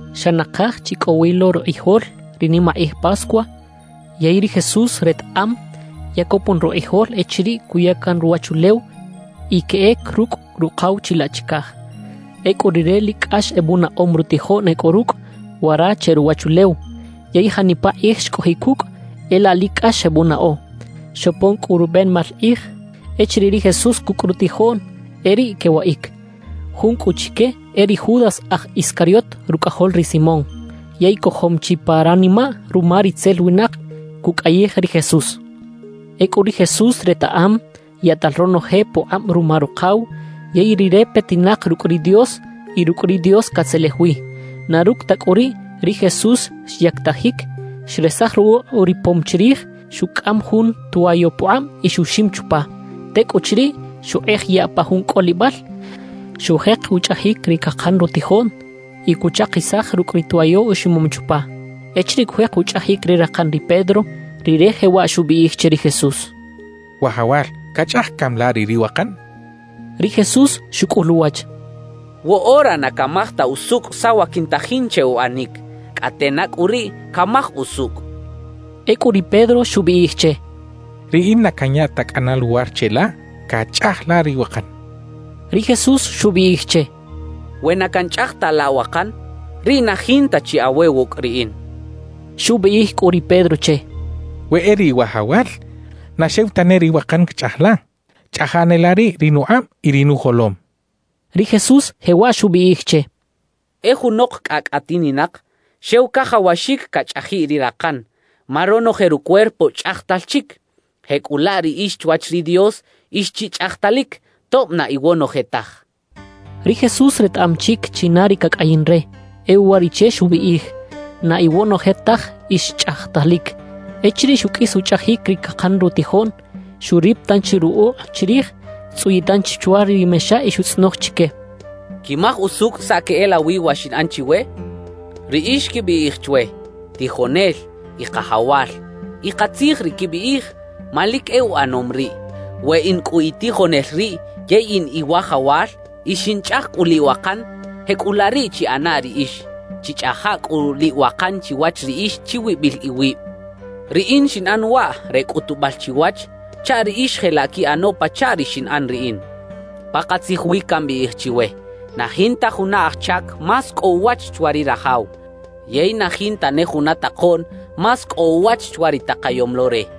Xa nakaj chi cꞌo wi lo rukꞌijol ri nimakꞌij Pascua yey ri Jesús retaꞌam ya copon rukꞌijol echiriꞌ cuya can ruwachulew y queꞌec rucꞌ Rukaw chilaꞌ chicaj. Ecꞌu Rire lic cꞌax ebunaꞌom rutijoꞌn e cꞌo rucꞌ wara che ruwachulew; yey janipa kꞌij xcꞌojiꞌ cucꞌ, e laꞌ lic cꞌax xebunaꞌo. Xopon cꞌu rubenebal kꞌij echiriꞌ ri Jesús cucꞌ rutijoꞌn e riꞌ quewaꞌic. Jun cꞌu chique e ri Judas aj Iscariot rucꞌajol ri Simón. Yey cojom chi pa ranimaꞌ ruma ritzel winak cucꞌayij ri Jesús. Ecꞌu ri Jesús retaꞌam yaꞌtal ronoje pukꞌab ruma Rukaw, yey Rire petinak rucꞌ ri Dios y rucꞌ ri Dios catzelej wi. Na rucꞌ ta cꞌu riꞌ, ri Jesús xyactajic, xresaj rukꞌuꞌ uripom chirij, xucꞌam jun twayo pukꞌab y xuxim chupa. Tecꞌuchiriꞌ xukꞌej yaꞌ pa jun cꞌolibal, xujek uchꞌajic ri cakan rutijoꞌn y cuchakisaj rucꞌ ri twayo uximom chupa. Echiriꞌ cujek uchꞌajic ri rakan ri Pedro, rire jewaꞌ xubiꞌij che ri Jesús: —Wajawal, ¿cachꞌaj cami la riꞌ ri wakan? —xchaꞌ. Ri Jesús xucꞌul uwach: —Woꞌora na camaj ta usucꞌ saꞌ wa quintajin che uꞌanic; cꞌate na cꞌu riꞌ camaj usucꞌ —xchaꞌ. Ecꞌu ri Pedro xubiꞌij che: —Riꞌin na canya ta cꞌana luwar cheꞌla cachꞌaj la ri wakan —xchaꞌ. Ri Jesús xubiꞌij che: —We na canchꞌaj ta laꞌ wakan, riꞌ na jinta chi awe wucꞌ riꞌin —xchaꞌ. Xubiꞌij cꞌu ri Pedro che: —We e riꞌ, Wajawal, na xew tane ri wakan cachꞌaj la; chꞌaja ne la riꞌ ri nukꞌab y ri nujolom —xchaꞌ. Ri Jesús jewaꞌ xubiꞌij che: —E junok cꞌacꞌ atininak, xew cajawaxic cachꞌajiꞌ ri rakan, ma ronoje rucuerpo chꞌajtal chic. Jecꞌulaꞌ riꞌix chwach ri Dios ix chi chꞌajtalic, tob na iwonoje taj —xchaꞌ. Ri Jesús retaꞌam chic china ri cacꞌayin re; e uwariꞌche xubiꞌij: “Na iwonoje taj ix chꞌajtalic.” Echiriꞌ xuqꞌuis uchꞌajic ri cakan rutijoꞌn, xurip tanchi rukꞌuꞌ chirij, xtzꞌuyiꞌ tanchi chwa ri mexa y xutzꞌonoj chique: —¿Quimaj usucꞌ saꞌ queꞌelawi wa xinꞌan chiwe? Riꞌix quibiꞌij chwe: “Tijonel” y “Kajawal” y katzij ri quibiꞌij, ma lic e uꞌanom riꞌ. We in cꞌu Itijonel riꞌ yey in Iwajawal y xinchꞌaj cꞌu liꞌwakan, jecꞌulaꞌ riꞌ chiꞌana riꞌix; chichꞌaja cꞌu liꞌwakan chiwach riꞌix chiwibil iwib. Riꞌin xinꞌan waꞌ re cꞌutubal chiwach, chaꞌ riꞌix jelaꞌ quiꞌano pachaꞌ ri xinꞌan riꞌin. Pakatzij wi cambiꞌij chiwe: Na jinta juna aj chac más cꞌo uwach chwa ri rajaw, yey na jinta ne juna takoꞌn más cꞌo uwach chwa ri takayom lo re.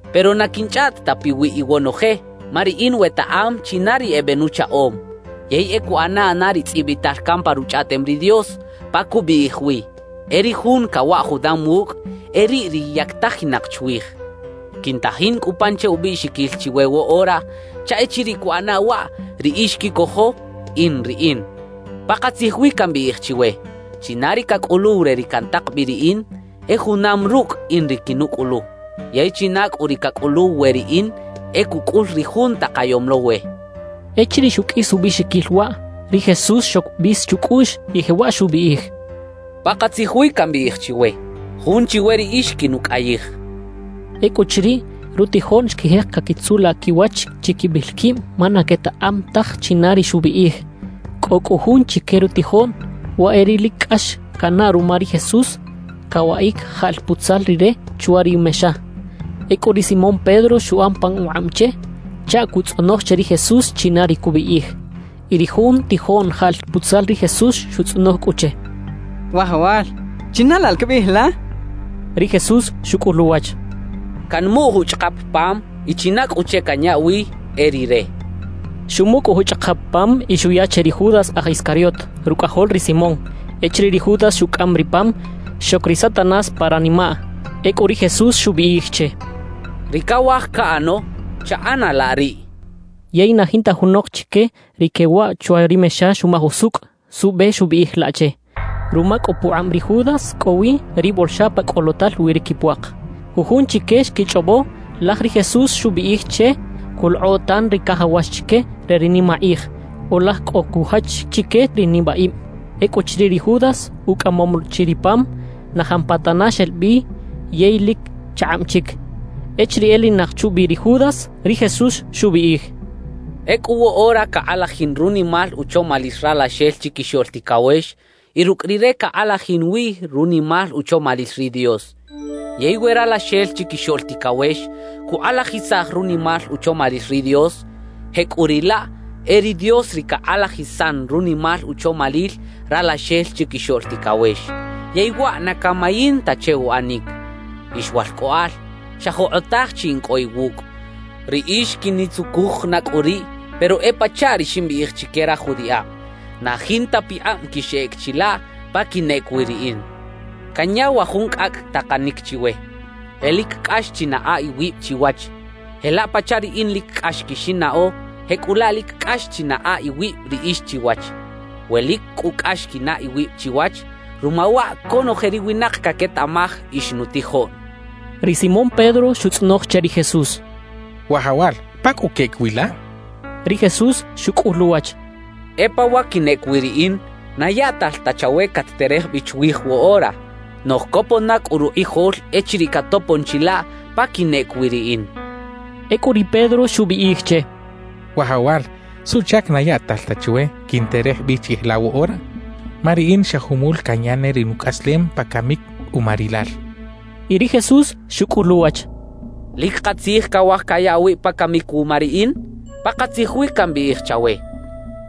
»Pero na quinchꞌaꞌt ta piwiꞌ iwonoje, ma riꞌin wetaꞌam china ri ebenuchaꞌom. Yey e cuꞌana na ri tzꞌibital can pa Ruchꞌaꞌtem ri Dios, pa cubiꞌij wi: E ri jun cawaꞌ junam wucꞌ, e riꞌ ri yactajinak chwij. Quintajin cꞌu pan che ubiꞌxiquil chiwe woꞌora chaꞌ echiriꞌ cuꞌana waꞌ, riꞌix quicojo: “In Riꞌin.” Pakatzij wi cambiꞌij chiwe: China ri cacꞌuluw re ri cantak bi riꞌin, e junam rucꞌ in ri quinucꞌulu; yey china cꞌu ri cacꞌuluw we riꞌin, e cucꞌul ri Jun takayom lo we —xchaꞌ. Echiriꞌ xuqꞌuis ubiꞌxiquil waꞌ, ri Jesús xoc bis chucꞌuꞌx y jewaꞌ xubiꞌij: —Pakatzij wi cambiꞌij chiwe: Jun chiwe riꞌix quinucꞌayij —xchaꞌ. Ecꞌuchiriꞌ, rutijoꞌn xquijek caquitzulaꞌ quiwach chiquibil quib ma na quetaꞌam taj china ri xubiꞌij. Cꞌo cꞌu jun chique rutijoꞌn, waꞌ e ri lic cꞌax canaꞌ ruma ri Jesús, cawaꞌic jaꞌl putzal Rire chwa ri mexa. Ecꞌu ri Simón Pedro xuꞌan pan ukꞌab che chaꞌ cutzꞌonoj che ri Jesús china ri cubiꞌij. Y ri jun tijoꞌn jaꞌl putzal ri Jesús xutzꞌonoj cꞌu che: —Wajawal, ¿china laꞌ la cabiꞌij la? —xchaꞌ. Ri Jesús xucꞌul uwach: —Canmuꞌ juchꞌakap pam y china cꞌu che canya wi, e rire —xchaꞌ. Xumuꞌ cꞌu juchꞌakap pam y xuya che ri Judas aj Iscariot, rucꞌajol ri Simón. Echiriꞌ ri Judas xucꞌam ri pam, xoc ri Satanás pa ranimaꞌ. Ecꞌu ri Jesús xubiꞌij che: —Ri cawaj caꞌano, chaꞌana laꞌ riꞌ —xchaꞌ. Yey na jinta junok chique ri quewaꞌ chwa ri mexa xumaj usucꞌ suꞌbe xubiꞌij laꞌ che. Ruma cꞌu pukꞌab ri Judas cꞌo wi ri bolxa pa cꞌolotal wi ri quipuak, jujun chique xquichꞌobo laj ri Jesús xubiꞌij che cuꞌlokꞌo tan ri cajawax chique re ri nimakꞌij, o laj cꞌo cujach chique ri nibaꞌib. Ecꞌuchiriꞌ ri Judas ucꞌamom chi ri pam, na jampatana xel bi yey lic chakꞌab chic. Echiriꞌ elinak chubi ri Judas, ri Jesús xubiꞌij: —Ecꞌu woꞌora cakꞌalajin runimal uchomalil Ralaxel Chiquixoꞌl Ticawex y rucꞌ Rire cakꞌalajin wi runimal uchomalil ri Dios. Yey we Ralaxel Chiquixoꞌl Ticawex cukꞌalajisaj runimal uchomalil ri Dios, jecꞌuriꞌlaꞌ e ri Dios ri cakꞌalajisan runimal uchomalil Ralaxel Chiquixoꞌl Ticawex, yey waꞌ na camayin ta che uꞌanic. »Ix walcꞌoꞌal, xa jokꞌotaj chi in cꞌo iwucꞌ. Riꞌix quinitzucuj na cꞌu riꞌ; pero e pachaꞌ ri ximbiꞌij chique raj judiꞌab, na jinta pikꞌab quixꞌec chilaꞌ pa quinꞌec wi riꞌin. »Canya wa jun cꞌacꞌ takanic chiwe: E lic cꞌax chinaꞌa iwib chiwach. Jelaꞌ pachaꞌ riꞌin lic cꞌax quixinnaꞌo, jecꞌulaꞌ lic cꞌax chinaꞌa iwib riꞌix chiwach. We lic cꞌu cꞌax quinaꞌ iwib chiwach, ruma waꞌ conoje ri winak caquetaꞌmaj ix nutijoꞌn —xchaꞌ. Ri Simón Pedro xutzꞌonoj che ri Jesús: —Wajawal, ¿pa cꞌu queꞌec wi la? —xchaꞌ. Ri Jesús xucꞌul uwach: —E pa wa quinꞌec wi riꞌin, na yaꞌtal ta chawe cat-terej bi chwij woꞌora; noꞌj copon na cꞌu rukꞌijol echiriꞌ catopon chilaꞌ pa quinꞌec wi riꞌin —xchaꞌ. Ecꞌu ri Pedro xubiꞌij che: —Wajawal, ¿suꞌchac na yaꞌtal ta chwe quinterej bi chiꞌij la woꞌora? Ma riꞌin xa jumul canya ne ri nucꞌaslem pa camic uma rilal —xchaꞌ. Y ri Jesús xucꞌul uwach: —¿Lic katzij cawaj caya awib pa camic wuma riꞌin? Pakatzij wi cambiꞌij chawe: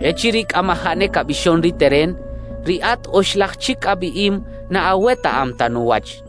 Echiriꞌ cꞌamajaꞌ ne cabixon ri teren, riꞌat oxlaj chic abiꞌim na awetaꞌam ta nuwach.